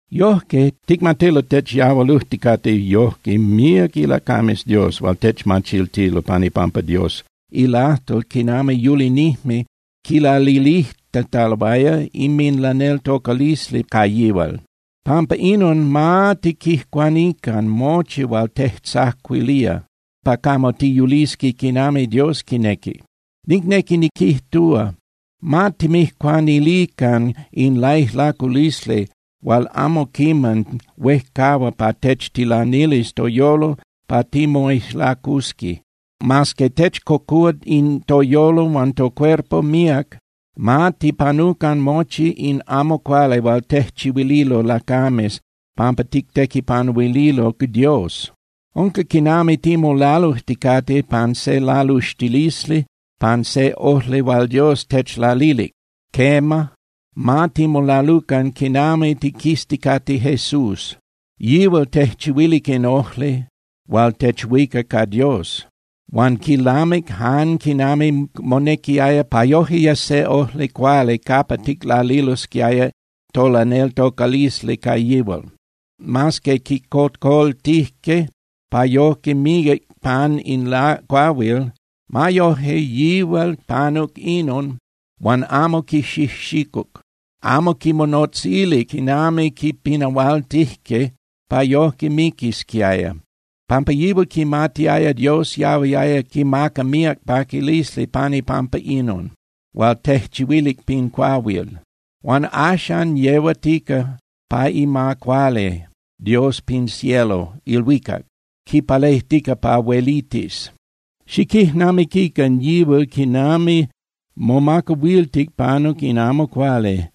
Yojque, ticmatilo techyahualujticate yojque míac ilacames Dios hual techmachiltilo pan ipampa Dios ilajtol quinami yulinijme quilalilijtataloaya inminlaneltocalisli ca yihual. Pampa inon, ma tiquijcuanican mochi hual tejtzacuilía pa camo tiyulisqui quinami Dios quinequi. Nicnequi niquijtúa, ma timijcuanilican in laijlaculisli hual amo quiman huejcahua pa techtilanilis toyolo pa timoijlacusqui. Mas que techcocúa toyolo huan tocuerpo míac, ma tipanucan mochi in amo cuali hual tejchihuililo lacames pampa tictequipanuililo Dios. Unca quinami timolalujticate pan se laluxtilisli pan se ojli hual Dios techlalilic. Quema, ma timolalucan quinami tiquizticate Jesús. Yihual tejchihuilic in ojli hual techhuica ca Dios. Huan quilamic jan quinami monequiaya pa yoje yes se ojli cuali capa ticlalilosquiaya tolaneltocalisli ca yihual. Mas que quicocoltijque pa yojque miquic pan in cuahuil, ma yoje yihual panuc inon huan amo quixijxicuc, amo quimonotzilic quinami quipinahualtijque pa yoje miquisquiaya, pampa yihual quimatiaya Dios yahuiaya quimaca míac paquilisli pan ipampa inon hual tejchihuilic pin cuahuil. Huan axan yehuatica pa ima cuali Dios pin cielo (ilhuicac) quipalejtica pa huelitis. Xiquijnamiquican yihual quinami momacahuiltic panuc in amo cuali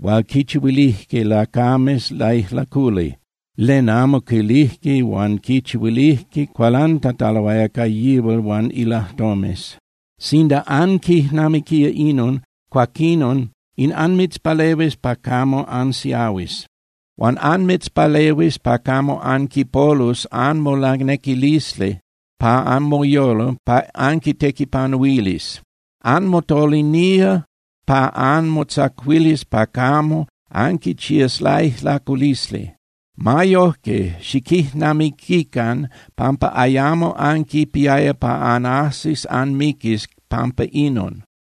hual quichihuilijque lacames laijlaculi, ¡len amo quilijque huan quichihuilijque cualantataloaya ca yihual huan ilajtomes! Sinda anquijnamiquía inon, cuaquinon in anmitzpalehuis pa camo ansiahuis. Huan anmitzpalehuis pa camo anquipolus anmolanequilisli pa anmoyolo pa anquitequipanuilis. Anmotolinía pa anmotzacuilis pa camo anquichías laijlaculisli. Ma yojque, xiquijnamiquican pampa ayamo anquipiaya pa anajsis anmiquis pampa inon.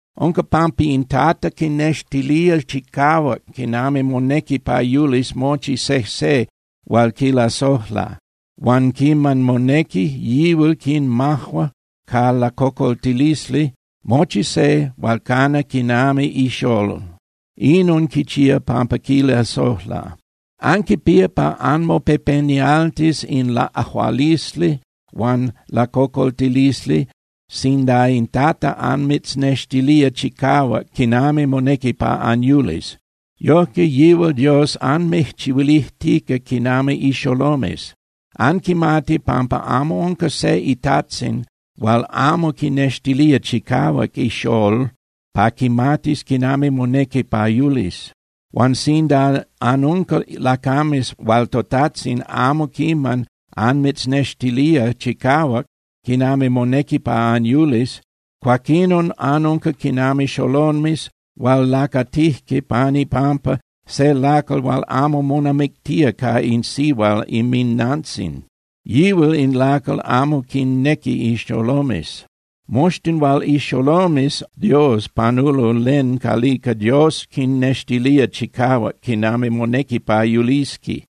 Unca pampa in Tata quinextilía chicahuac quinami monequi pa yulis mochi sejse hual quilasojla. Huan quiman monequi, yihual quinmajua ca lacocoltilisli mochi se hual cana quinami ixolol, inon quichía pampa quilasojla. Anquipía pa anmopepenialtis in laꞌajualisli huan lacocoltilisli sinda in Tata anmitznextilía chicahuac quinami monequi pa anyulis. Yojque yihual Dios anmijchihuilijtica quinami ixolomes. Anquimati pampa amo unca se itajtzin hual amo quinextilía chicahuac ixolol pa quimatis quinami monequi pa yulis. Huan sinda anunca lacames hual toTajtzin amo quiman anmitznextilía chicahuac quinami monequi pa anyulis, cuaquinon anunca quinami xolomes hual lacatijque pan ipampa se lacal hual amo monamictía ca in sihual inminnantzin, yihual in lacal amo quinnequi in xolomes. Moxtin hual ixolomes Dios panulo len calica Dios quinnextilía chicahuac quinami monequi pa yulisqui.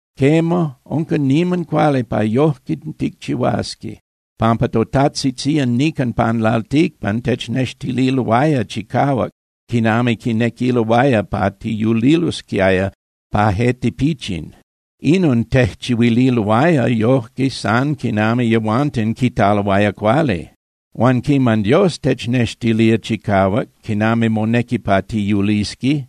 Quema, unca niman cuali pa yojque ticchihuasqui, pampa totajtzitzían nican pan lalticpan technextililoaya chicahuac quinami quinequiloaya pa tiyulilosquiaya pa je tipichin. Inon tejchihuililoaya yojque san quinami yehuanten quitaloaya cuali. Huan quiman Dios technextilía chicahuac quinami monequi pa tiyulisqui,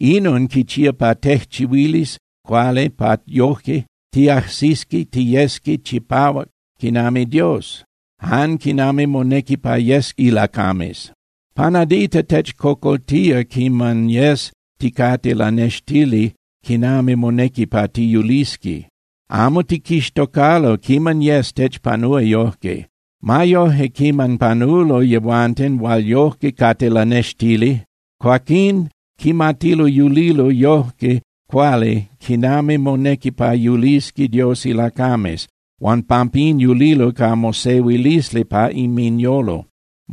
inon quichía pa tejchihuilis cuali pa yoje tiajsisqui tiyesqui chipahuac quinami Dios, jan quinami monequi pa yesqui ilacames. Pa nadita techcocoltía quiman yes ticate lanextili quinami monequi pa tiyulisqui. Amo tiquixtocalo quiman yes techpanúa yojque. Ma yoje, quiman panulo yehuanten hual yojque cate lanextili, cuaquín quimatilo yulilo yojque cuali quinami monequi pa yulisqui Dios ilacames, huan pampín yulilo ca mosehuilisli pa inminyolo.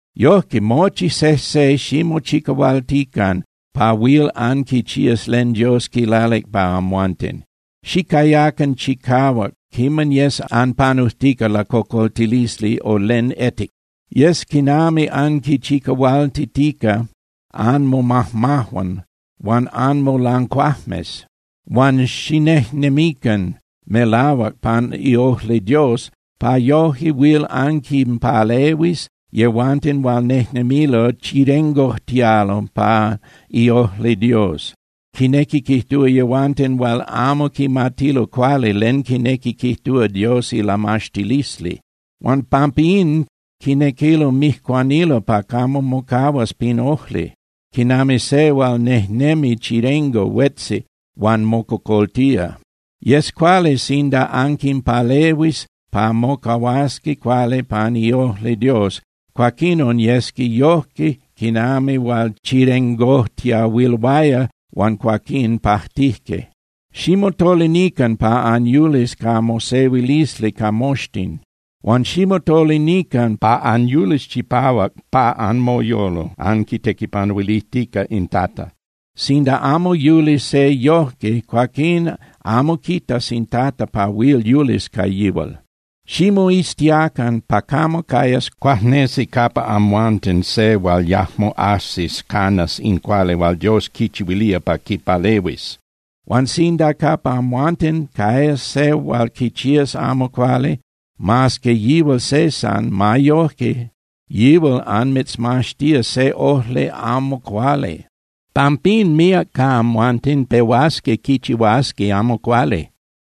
Yojque, mochi sejse ximochicahualtican pa huil anquichías len Dios quilalic pa amhuanten. Xicayacan chicahuac quiman yes anpanujtica lacocoltilisli o len etic. Yes quinami anquinchicahualtitica anmomajmajuan huan anmolancuajmes. Huan xinejnemican melahuac pan iojli Dios pa yoje huil anquinpalehuis yehuanten hual nejnemilo chirengojtialo pa iojli Dios, quinequi quijtúa yehuanten hual amo quimatilo cuali len quinequi quijtúa Dios ilamaxtilisli. Huan pampín quinequilo mijcuanilo pa camo mocahuas pin ojli, quinami se hual nejnemi chirengo huetzi huan mococoltía. Yes cuali sinda anquinpalehuis pa mocahuasqui cuali pan iojli Dios, cuaquinon yesqui yojque quinami hual chirengojtiahuiloaya huan cuaquín pajtijque. Ximotolinican pa anyulis ca mosehuilisli ca moxtin, huan ximotolinican pa anyulis chipahuac pa anmoyolo anquitequipanuilijtica in Tata. Sinda amo yuli se yojque, cuaquín amo quitas in Tata pa huil yulis ca yihual. Ximoiztiacan pa camo cayas cuajnesi capa amhuanten se hual yajmo ajsis canas in cuali hual Dios quichihuilía pa quipalehuis. Huan sinda capa amhuanten cayas se hual quichías amo cuali, mas que yihual se san, ma yoje yihual anmitzmaxtía se ojli amo cuali. Pampín míac ca amhuanten pehuasqui quichihuasqui amo cuali.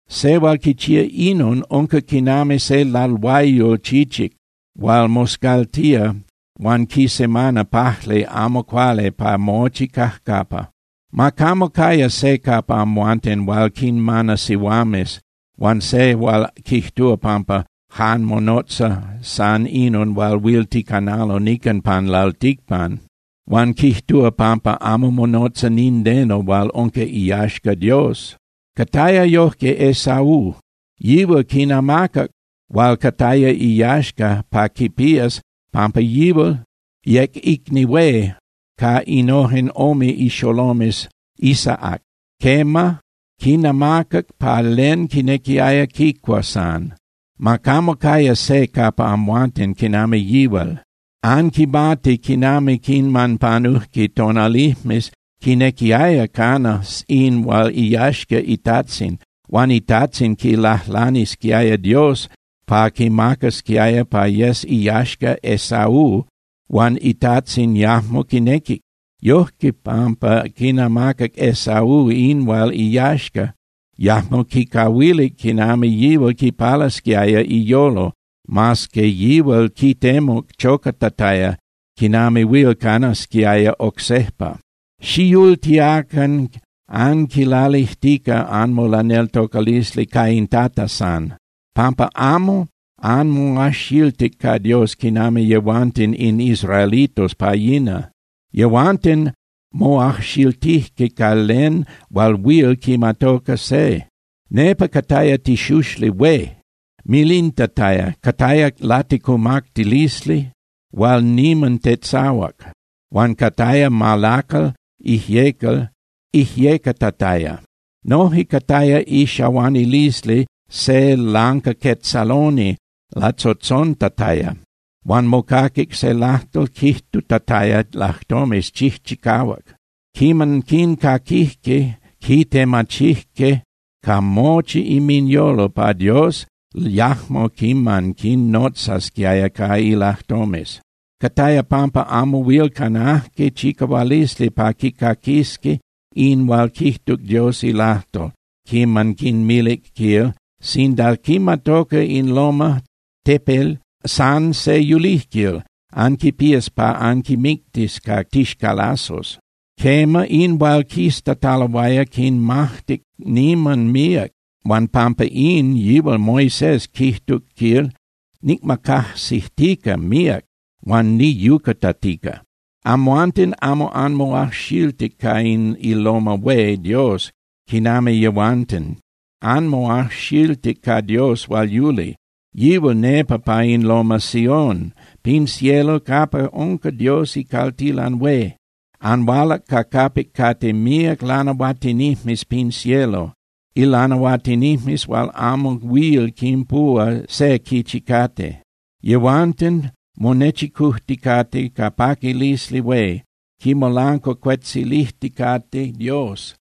Se hual quichía inon unca quinami se lalhuayol chichic hual moscaltía huan quisemana pajli amo cuali pa mochi cajcapa. Ma camo caya se capa amhuanten hual quinmana sihuames, huan se hual quijtúa pampa jan monotza san inon hual huil ticanalo nican pan lalticpan, huan quijtúa pampa amo monotza nindeno hual unca iyaxca Dios. Cataya yojque Esaú. Yihual quinamacac hual cataya iyaxca pa quipías, pampa yihual yec icni hué ca innojen ome ixolomes Isaac. Quema, quinamacac pa len quinequiaya quicua san. Ma camo caya se capa amhuanten quinami yihual. Anquimati quinami quiman panujque tonalijmes, quinequiaya cana in hual iyaxca itajtzin hual itajtzin quilajlanisquiaya Dios pa quimacasquiaya pa yes iyaxca Esaú, huan itajtzin yajmo quinequic. Yojque, pampa quinamacac Esaú in hual iyaxca, yajmo quicahuilic quinami yihual quipalasquiaya iyolo mas que yihual quitemuc chocatataya quinami huil canasquiaya oc sejpa. Xiyultiacan anquilalijtica anmolaneltocalisli ca in Tata san, pampa amo anmoajxiltic ca Dios quinami yehuanten in israelitos pa yina. Yehuanten moajxiltijque ca len hual huil quimatoca se. Nepa cataya tixuxli hué milintataya, cataya laticumactilisli hual niman tetzahuac, huan cataya malacal ijyecal ijyecatataya. Noje cataya ixahuanilisli se lancaquetzaloni latzotzontataya. Huan mocaquic se lajtol quijtutataya lajtomes chijchicahuac. Quiman quincaquijque, quitemachijque ca mochi inminyolo pa Dios yajmo quiman quinnotzasquiaya ca ilajtomes. Cataya pampa amo huil canajque chicahualisli pa quicaquisqui in hual quijtuc Dios ilajtol quiman quinmilic, quil: “Sinda quimatoca in loma (tepel) san se yulijquil, anquipías pa anquimictis ca tixcalazos.” Quema, in hual quiztataloaya quinmajtic niman míac huan pampa in, yihual Moisés quijtuc, quil: “Nicmacajsijtica míac huan niyuyucatica.” Amhuanten amo anmoajxiltic ca in iloma hué Dios quinami yehuanten. Anmoajxiltic ca Dios hual yuli. Yihual nepa pa in loma Sión pin cielo capa unca Dios icaltilan hué. Anhualac ca capic cate míac ilanahuatinijmes pin cielo, ilanahuatinijmes hual amo huil quinpuhua se quichi cate. Yehuanten monechicujticate ca paquilisli hué quimolancuacuetzilijticate Dios.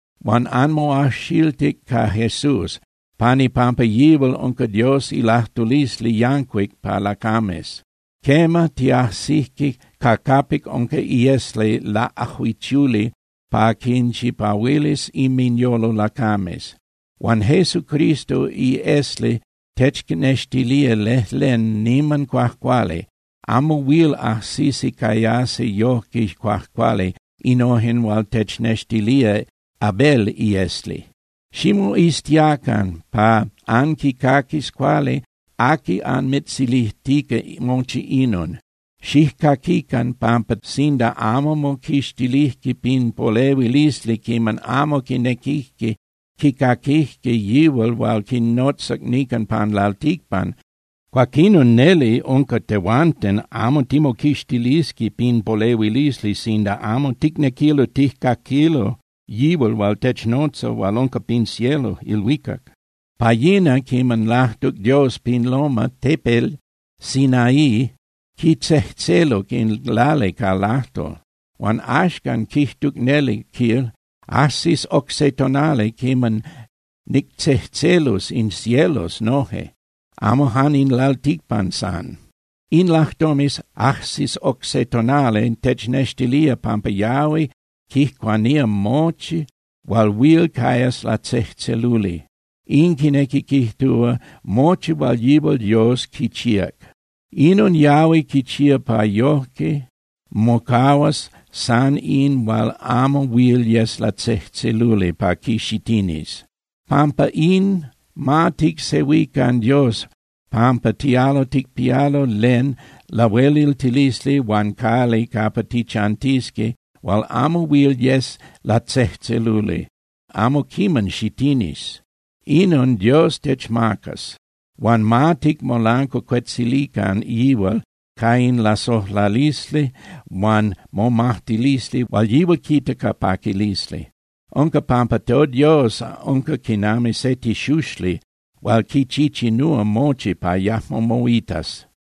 Huan anmoajxiltic ca Jesús. Pan ipampa yihual unca Dios ilajtulisli yancuic pa lacames. Quema, tiajsijque ca capic unca iesli laꞌajuichuli pa quinchipahuilis inminyolo lacames. Huan Jesucristo iesli technextilía lejlen niman cuajcuali. Amo huil ajsisi cayasi yojque cuajcuali innojen hual technextilía Abel iesli. Ximoiztiacan pa anquicaquis cuali aqui anmitzilijtica mochi inon. Xijcaquican, pampa sinda amo moquixtilijque pin polehuilisli quiman amo quinequijque quicaquijque yihual hual quinnotzac nican pan lalticpan, cuaquinon neli unca tehuanten amo timoquixtilisqui pin polehuilisli sinda amo ticnequilo tijcaquilo yihual hual technotza hual unca pin cielo (ilhuicac). Pa yina quiman lajtuc Dios pin loma (tepel) Sinaí, quitzejtzeluc in lali ca ilajtol. Huan axcan quijtuc neli, quil: “Ajsis oc se tonali quiman nictzejtzelus in cielos noje, amo jan in lalticpan san.” In lajtomes “Ajsis oc se tonali” technextilía pampa yahui quijcuanía mochi hual huil cayas latzejtzeluli. In quinequi quijtúa mochi hual yihual Dios quichíac. Inon yahui quichía pa yoje mocahuas san in hual amo huil yes latzejtzeluli pa quixitinis. Pampa in, ma ticsehuican Dios pampa tialo ticpialo len lahueliltilisli huan cali capa tichantisqui hual amo huil yes latzejtzeluli, amo quiman xitinis, inon Dios techmacas. Huan ma ticmolancuacuetzilican yihual ca in lasojlalisli huan momajtilisli hual yihual quita ca paquilisli. Unca pampa toDios unca quinami se tixuxli hual quichichinúa mochi pa yajmo moitas.